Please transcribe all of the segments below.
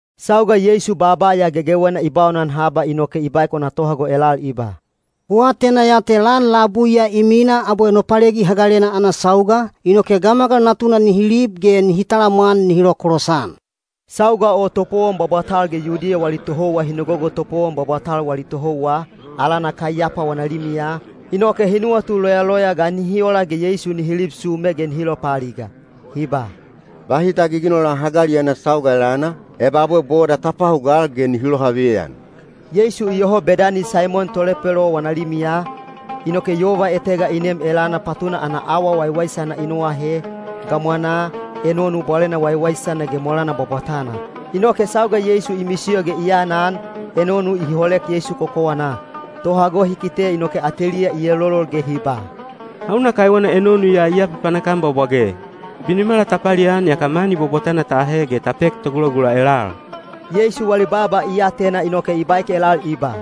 Sauga Yeisu baaba ya gegewena i baunan haba, inoke i baek wana tohago elal i ba, “Ku atena ya te lan labui ya i mina abwe Nopalegi Hagalena ana sauga, inoke Gamagal Natuna nihi lib ge nihi talamwan nihi lokolosan.” Sauga o topowon bwabwatal ge Yudiya wali tohouwa hi nogogo topowon bwabwatal wali tohouwa, alana Kaiyapa wana limiya, inoke hi nuwatu loyaloya ga nihi ola ge Yeisu nihi lib sume ge nihi lopaaliga. Hi ba, “Bahi ta giginola hagali ana sauga elana, eba abwe boda ta pahugal ge nihi lohaveyan.” Yeisu iyoho Bedani Saimon tolepelo wana limiya, inoke yova etega i nem elana patuna ana awa waiwaisana i noahe, gamwanaa, enonu bwalena waiwaisana ge molana bwabwatana. Inoke sauga Yeisu i misiyo ge i anan, enonu i holek Yeisu kokowanaa. Tohago hi kite inoke ateliya i elolol ge hi ba, “Hauna kaiwena enonu ya i apapanak-an bwabwage? Binimala ta palian yaka mani bwabwatana ta ahe ge ta pek togulagula elal.” Yeisu wali baaba i atena inoke i baek elal i ba,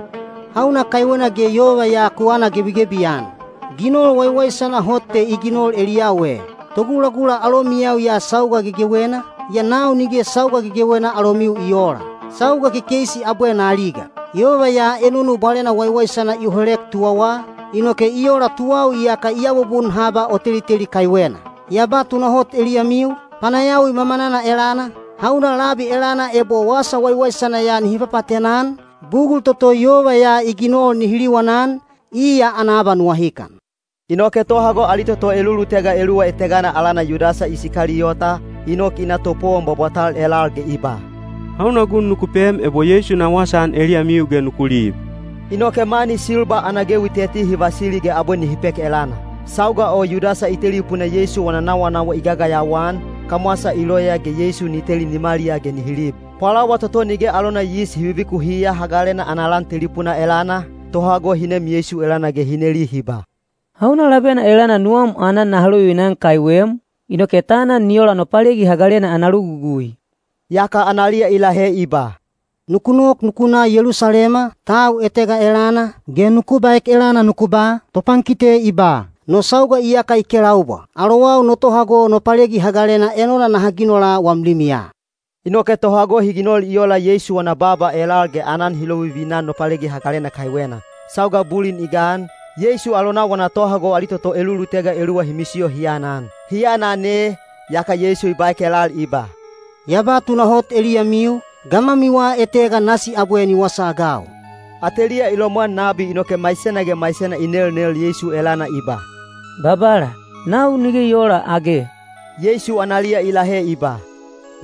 “Hauna kaiwena ge yova ya ku anagebigebi-an? Ginol waiwaisana hot te i ginol eliyau e. Togulagula alomiyau ya sauga gegewena, yaa nau nige sauga gegewena alomiu i oola. Sauga kekeisi abwe na aliga. Yova ya enonu bwalena waiwaisana i holek tuwawa, inoke i ola tuwau iyaka i abubun haba o teliteli kaiwena. Ya ba tunahot eliyamiu, panayawi mamanana elana, hauna labi elana ebo wasa waiwaisana ya nihi papaatena-an, bugul toto yova ya i ginol nihi liwanan, iya ana abanuwahikan.” Inoke tohago ali toto elulutega eluwa etegana alana Yudasa Isikaliyota, i nok i na topowon bwabwatal elal ge i ba, “Hauna gun nuku pem ebo Yeisu na wasaan eliyamiu ge nuku lib?” Inoke mani silba ana gewi teti hi vasili ge abwe nihi pek elana. Sauga o Yudasa i telipuna Yeisu wana nawanawa i gagayawa-an, kamwasa i loya ge Yeisu ni teli nimaliyaa ge nihi lib. Pwalawa toto Nige alona Yis Hi Vivikuhiya Hagalena ana lan telipuna elana, tohago hi nem Yeisu elana ge hi neli hi ba, “Hauna labena elana nuwam aanan naha lovivina-an kaiwem, inoke ta anan ni ola Nopalegi Hagalena ana logugui?” Yaka analiya i lahe i ba, “Nuku nok nuku na Yelusalema, tau etega elana, ge nuku baek elana nuku ba, ‘Topankite i ba: No sauga iyaka i kelaubwa. Alowau no tohago Nopalegi Hagalena enona naha ginola wam limiya.’” Inoke tohago hi ginol i ola Yeisu wana baaba elal ge aanan hi lovivina-an Nopalegi Hagalena kaiwena. Sauga bulin i gan, Yeisu alonau wana tohago ali toto elulutega eluwa hi misiyo hi anan. Hi aanan ee, yaka i baek elal i ba, “Ya ba tunahot eliyamiu, gamwamiwa etega nasi abwe ni wasaagau.” Ateliya i lomwan nabi inoke maisena ge maisena i nelnel Yeisu elana i ba, “Babala, nau nige i oola age?” Yeisu analiya i lahe i ba,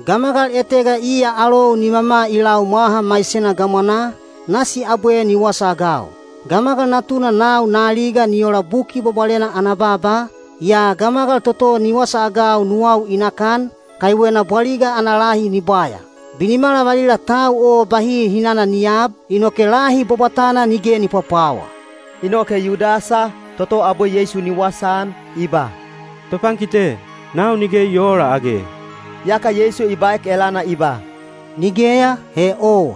“Gamagal etega iya alou nimama i lau mwaha maisena gamwanaa, nasi abwe ni wasaagau. Gamagal Natuna nau na aliga ni ola Buki Bwabwalena ana baaba, yaa gamagal toto ni wasaagau nuwau i nakan, kaiwena bwaliga ana lahi ni bwaya. Binimala valila tau o bahi hinana ni aab, inoke lahi bwabwatana nige ni pwapwawa.” Inoke Yudasa, toto abwe Yeisu ni wasaan, i ba, “Topankite, nau nige i oola age?” Yaka Yeisu i baek elana i ba, “Nigeya, he owa.”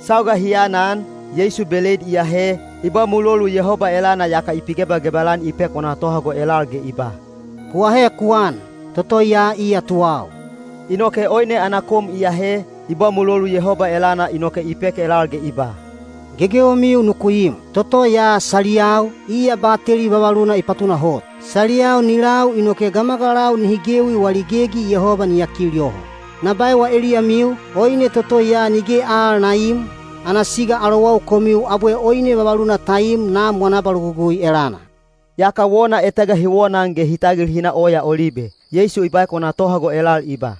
Sauga hi aanan, Yeisu beleid i ahe, i ba mulolu Yehoba elana yaka i pigebagebal-an i pek wana tohago elal ge i ba, “Ku ahe ku an. Toto ya iya tuwau.” Inoke oine ana kom i ahe, i ba mulolu Yehoba elana inoke i pek elal ge i ba, “Gegewemiu nuku im. Toto ya saliyau, iya bateli vavaluna i patunahot. Saliyau ni lau inoke gamagalau nihi gewi wali gegi Yehoba ni yakil yoho. Na baewa eliyamiu, oine toto ya nige al na iim, ana siga alowau komiu abwe oine vavaluna ta im Nam wana abalogugui elana.” Yaka wona etega hi wonaan ge hi tagil hi na Oya Olibe. Yeisu i baek wana tohago elal i ba,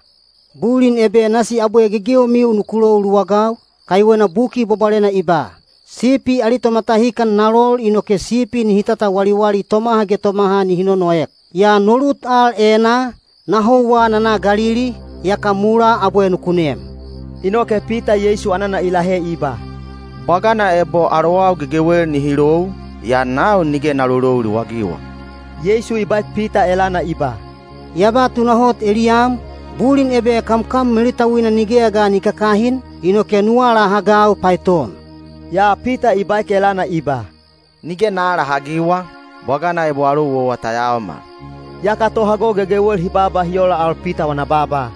“Bulin ebe nasi abwe gegewemiu nuku lou luwagau, kaiwena Buki Bwabwalena i ba, ‘Sipi ali tomatahikan na lol inoke sipi nihi tatawaliwali tomaha ge tomaha nihi nonoek.’ Yaa no lut al enaa, na houwa na na Galili, yaka mulaa abwe nuku nem.” Inoke Pita Yeisu anana i lahe i ba, “Bwagana ebo alowau gegewel nihi lou, yaa nau nige na lolou luwagiwa.” Yeisu i baek Pita elana i ba, “Ya ba tunahot eliyam, bulin ebe kamkam melutauina nigeya ga ni kakahin, inoke nu alahagau paeton.” Yaa Pita i baek elana i ba, “Nige na aalahagiwa, bwagana ebo alou owa ta yaomal.” Yaka tohago gegewel hi baaba hi ola al Pita wana baaba.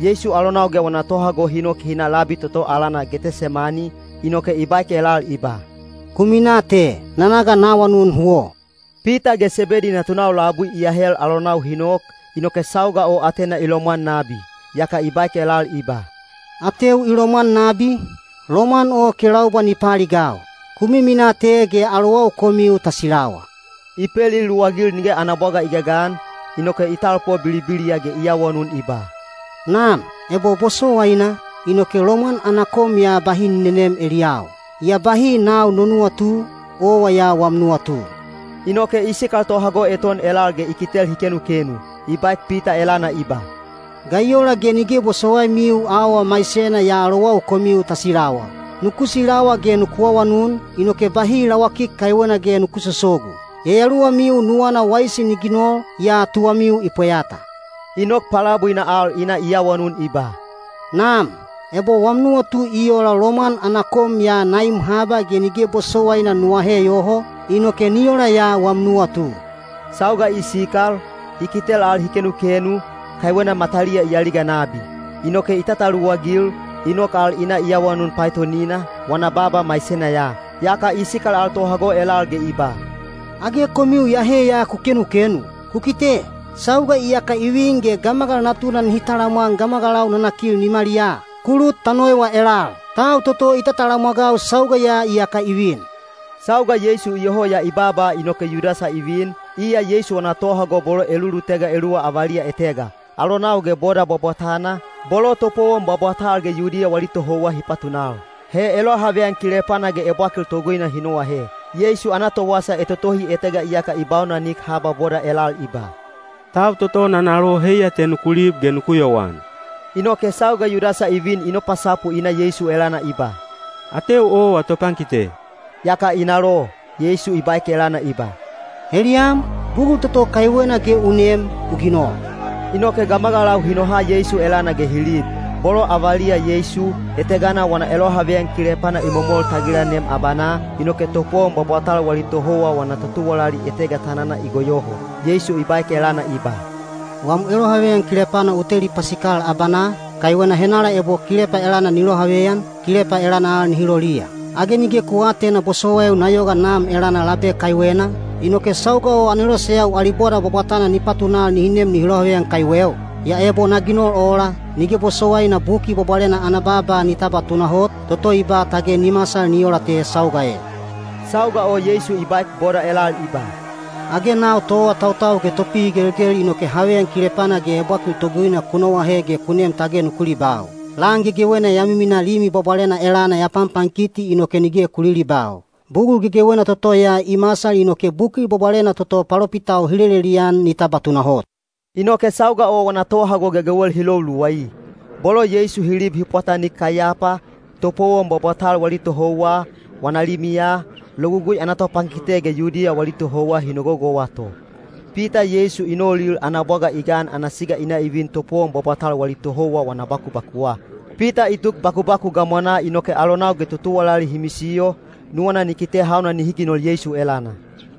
Yeisu alonau ge wana tohago hi nok hi na labi toto alana Getesemani, inoke i baek elal i ba, “Ku minaa te, na na ga na awanun huwo.” Pita ge Sebedi natunau labui i ahel alonau hi nok, inoke sauga o atena i lomwan nabi. Yaka i baek elal i ba, “Ateu i lomwan nabi, lomwan o kelaubwa ni paaligau. Ku miminaa te ge alowau komiu ta silawa.” I peliluwagil nige ana bwaga i gagan, inoke i talpo bilibiliya ge i awanun i ba, “Nam, ebo bosowaina, inoke lomwan ana kom ya bahi ni nenem eliyau. Yaa bahi nau no nuwatu, owa ya wam nuwatu.” Inoke i sikal tohago eton elal ge i kitel hi kenukenu. I baek Pita elana i ba, “Ga i ola ge nige bosowaimiu auwa maisena ya alowau komiu ta silawa? Nuku silawa ge nuku awanun, inoke bahi lawakik kaiwena ge nuku sosogu. Yayaluwamiu nuwana waisi ni ginol, yaa tuwamiu i pweyata.” I nok palabuina al i na i awanun i ba, “Nam, ebo wam nuwatu i ola lomwan ana kom ya na im haba ge nige bosowaina nu ahe yoho, inoke ni ola ya wam nuwatu.” Sauga i sikal, i kitel al hi kenukenu, kaiwena mataliya i aliga nabi. Inoke i tataluwagil, i nok al i na i awanun paetonina, wana baaba maisena ya. Yaka i sikal al tohago elal ge i ba, “Age komiu iyahe ya ku kenukenu? Ku kite, sauga iyaka i vin ge Gamagal Natuna nihi talamwan gamagalau nanakil nimaliyaa. Ku lut ta noewa elal. Tau toto i tatalamwagau, sauga ya iyaka i vin!” Sauga Yeisu iyoho ya i baaba inoke Yudasa i vin, iya Yeisu wana tohago bolo elulutega eluwa avaliya etega. Alonau ge boda bwabwatana, bolo topowon bwabwatal ge Yudiya wali tohouwa hi patunal. He elohaveyan kilepana ge ebwakil toguina hi noahe. Yeisu ana towasa etotohi etega iyaka i baunanik haba boda elal i ba, “Tau toto na nalo heiya te nuku lib ge nuku yowan.” Inoke sauga Yudasa i vin i nopasapu i na Yeisu elana i ba “Ateu owa topankite,” yaka i nalo. Yeisu i baek elana i ba, “Heliyam, bugul toto kaiwena ge u nem, u ginol.” Inoke gamagalau hi noha Yeisu elana ge hi lib. Bolo avaliya Yeisu, etegana wana elohaveyan kilepana i momol tagilanem abanaa, inoke topowon bwabwatal wali tohouwa wana totuwalali etega tanana i goyoho. Yeisu i baek elana i ba, “Wam elohaveyan kilepana u teli pasikal abanaa, kaiwena henala ebo kilepa elana ni lohaveyan, kilepa elana al nihi loliya. Age nige ku aatena bosowaiu na yoga Nam elana labe kaiwena, inoke sauga o aneloseyau ali boda bwabwatana ni patunal nihi nem nihi lohaveyan kaiweu? Yaa ebo na ginol ola, nige bosowaina Buki Bwabwalena ana baaba ni tabwa tunahot, toto i ba tage ni masal ni ola te sauga e.” Sauga o Yeisu i baek boda elal i ba, “Age nau toawatautau ge topihigelgel inoke haveyan kilepana ge ebwakil toguina ku noahe ge ku nem tage nuku libau! Lan gegewena ya miminaa Limi Bwabwalena elana ya panpankiti inoke nige ku lilibau. Bugul gegewena toto ya i masal inoke Buki Bwabwalena toto palopitau hi lelelian ni tabwa tunahot.” Inoke sauga o wana tohago gegewel hi lou luwai. Bolo Yeisu hi lib hi pwatanik Kaiyapa, topowon bwabwatal wali tohouwa, wana limiya, Logugui ana topankite ge Yudiya wali tohouwa hi nogogowa to. Pita Yeisu i noulil ana bwaga i gan ana siga hi vin topowon bwabwatal wali tohouwa wana bakubakuwa. Pita i tuk bakubaku gamwanaa inoke alonau ge totuwalali hi misiyo, nuwana ni kite hauna nihi ginol Yeisu elana.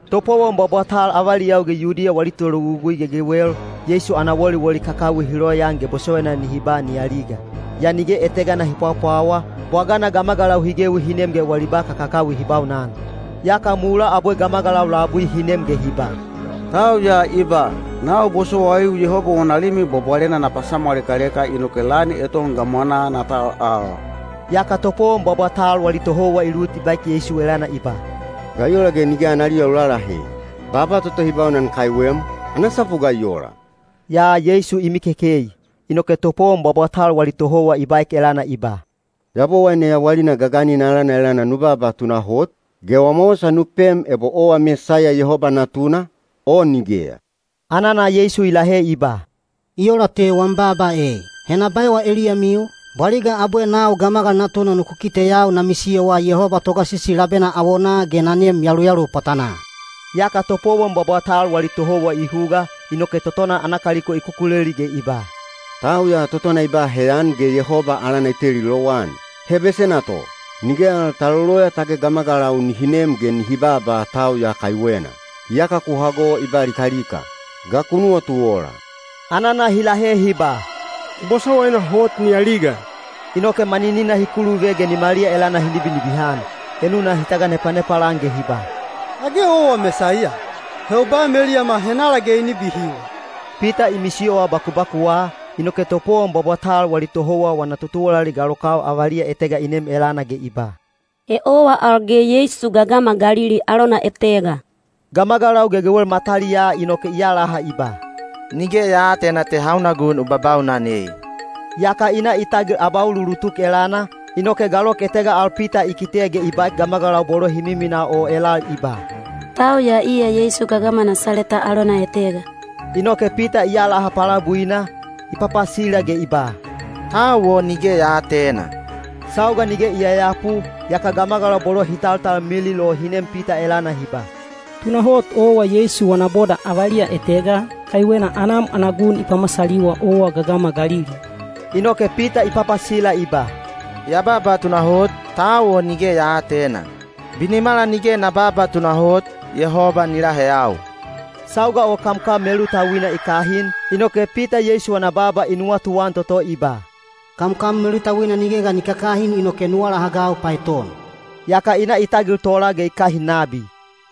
Topowon bwabwatal avaliyau ge Yudiya wali tologugui gegewel, Yeisu ana woliwoli kakawi hi loyaan ge bosowaina nihi ba ni aliga. Yaa nige etegana hi pwapwawa, bwagana gamagalau hi gewi hi nem ge wali ba kakakawi hi baunan. Yaka mulaa abwe gamagalau labui hi nem ge hi ba, “Tau ya i ba, ‘Nau bosowaiu Yehoba wana Limi Bwabwalena na pasamwalekaleka inoke lan eton gamwanaa na tal al.’” Yaka topowon bwabwatal wali tohouwa i lut ge i baek Yeisu elana i ba, “Ga i ola ge nige analiya u lalahe? Baaba toto hi baunan kaiwem, ana sapu ga i ola?” Yaa Yeisu i mikekei. Inoke topowon bwabwatal wali tohouwa i baek elana i ba, “Yabowaine yawalina gaganina alana elana nu baaba tunahot, ge wama wasa nu pem ebo owa Mesaiya Yehoba Natuna, o nigeya.” Anana Yeisu i lahe i ba, “I ola te wam baaba ei. He na baewa eliyamiu, bwaliga abwe nau Gamagal Natuna nuku kiteyau na misiyowa Yehoba Togasisi labena awonaa ge na neem yaluyalu pwatanaa.” Yaka topowon bwabwatal wali tohouwa i huga, inoke totona ana kaliko i kukuleli ge i ba, “Tau ya totona i ba heyan ge Yehoba alana i teli lowan. He besena to. Nige al ta loloya tage gamagalau nihi nem ge nihi baaba tau ya kaiwena. Iyaka ku hago i ba likalika. Ga ku nuwatu ola?” Anana hi lahe hi ba, “I bosowaina hot ni aliga.” Inoke maninina hi kuluve ge nimaliya elana hi nibinibihan. Enuna hi taganepanepal-an ge hi ba, “Age owa Mesaiya? He u baem eliyama henala ge i nibihiwa.” Pita i misiyowa bakubakuwa, inoke topowon bwabwatal wali tohouwa wana totuwalali galokau avaliya etega i nem elana ge i ba, “He owa al ge Yeisu gagama Galili alona etega.” Gamagalau gegewel mataliyaa inoke i alaha i ba, “Nige ya aatena te hauna gun u babaunan ei.” Yaka i na i tagil abauluulutuk elana, inoke galok etega al Pita i kite ge i baek gamagalau bolo hi minamina o elal i ba, “Tau ya iya Yeisu gagama Nasaleta alona etega.” Inoke Pita i alaha palabuina, i papasila ge i ba, “Tau o nige ya aatena.” Sauga nige i yayapu, yaka gamagalau bolo hi taltalmilil o hi nem Pita elana hi ba, “Tunahot owa Yeisu wana boda avaliya etega, kaiwena anam ana gun i pamasaliwa owa gagama Galili.” Inoke Pita i papasila i ba, “Ya baaba tunahot, tau o nige ya aatena. Binimala nige na babaa tunahot, Yehoba ni laheyau.” Sauga o kamkam melutauina i kahin, inoke Pita Yeisu wana baaba i nuwatuan toto i ba: “Kamkam melutauina nige ga ni kakahin inoke nu alahagau paeton.” Yaka i na i tagil tola ge i kahin nabi.